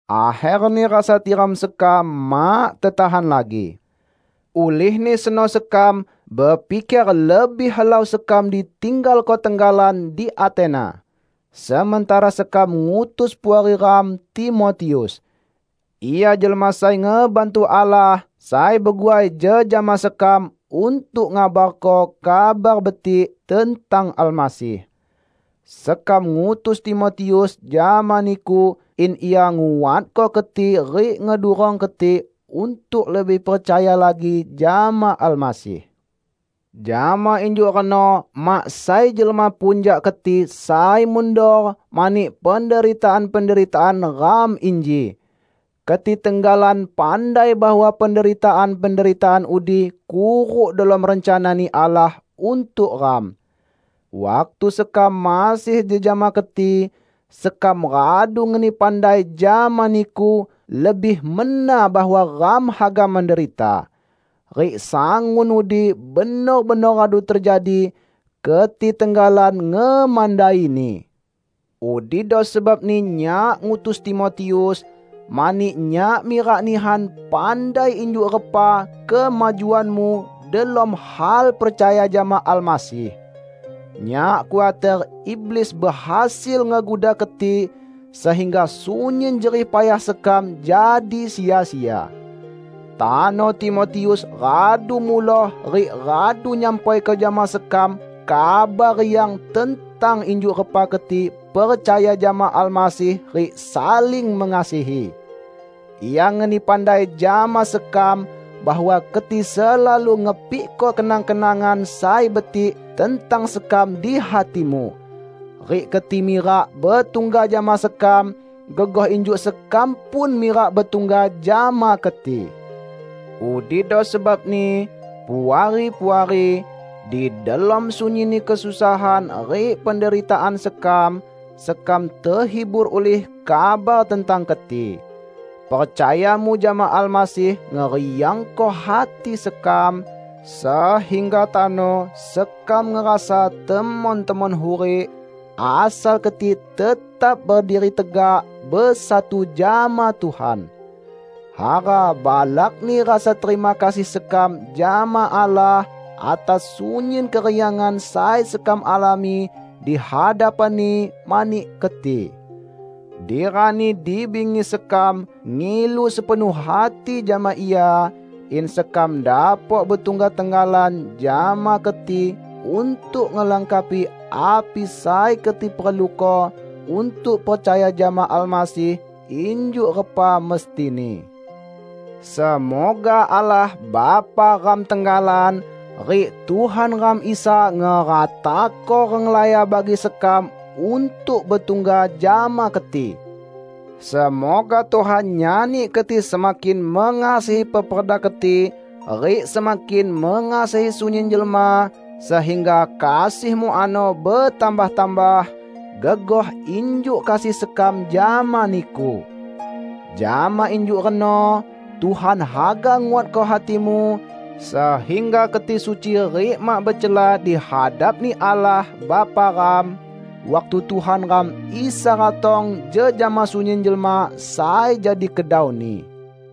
Akherni rasa tiram sekam mak tetahan lagi. Ulihni seno sekam bepiker lebih helau sekam ditinggalko tenggalan di Atena, sementara sekam ngutus puari ram Timotius. Ia jelma sai ngebantu Allah sai beguai jejama sekam untuk ngabarko Kabar Betik tentang Almasih. Sekam ngutus Timotius jama niku in ia nguatko keti rik ngedurong keti untuk lebih percaya lagi jama Almasih. Jama injuk reno mak sai jelma pun jak keti sai mundor mani penderitaan-penderitaan ram inji. Keti tenggalan pandai bahwa penderitaan-penderitaan udi kuruk delom rencana-Ni Allah untuk ram. Waktu sekam masih jejama keti, sekam radu ngeni pandai jama niku lebih mena bahwa ram haga menderita. Rik sangun udi benor-benor radu tejadi, keti tenggalan ngemandaini. Udido sebabni nyak ngutus Timotius, mani nyak mirak nihan pandai injuk repa kemajuanmu delom hal percaya jama Almasih. Nyak khuater iblis behasil ngeguda keti sehingga sunyin jerih payah sekam jadi sia-sia. Tano Timotius radu muloh rik radu nyampaiko jama sekam kabar riang tentang injuk repa keti percaya jama Almasih rik saling mengasihi. Ia ngeni pandai jama sekam bahwa keti selalu ngepikko kenang-kenangan sai betik tentang sekam di hatimu. Rik keti mirak betungga jama sekam, gegoh injuk sekam pun mirak betungga jama keti. Udido sebabni, Puari-puari, di delom sunyinni kesusahan rik penderitaan sekam, sekam tehibur ulih kabar tentang keti. Percayamu jama Almasih ngeriangko hati sekam, sehingga tano sekam ngerasa temon-temon hurik, asal keti tetap berdiri tegak, besatu jama Tuhan. Hara balakni rasa terima kasih sekam jama Allah atas sunyin keriangan sai sekam alami di hadapan-Ni mani keti. Di rani di bingi sekam ngilu sepenuh hati jama Ia, in sekam dapok betungga tenggalan jama keti untuk ngelengkapi api sai keti perluko untuk percaya jama Almasih injuk repa mestini. Semoga Allah Bapa ram tenggalan, rik Tuhan ram Isa ngeratako renglaya bagi sekam untuk betungga jama keti! Semoga Tuhan nyani keti semakin mengasihi peperda keti rik semakin mengasihi sunyin jelma, sehingga kasihmu ano betambah-tambah, gegoh injuk kasih sekam jama niku. Jama injuk reno Tuhan haga nguatko hatimu, sehingga keti suci rik mak becela di hadap-Ni Allah Bapa ram, waktu Tuhan ram Isa ratong jejama sunyin jelma sai jadi kedau-Ni.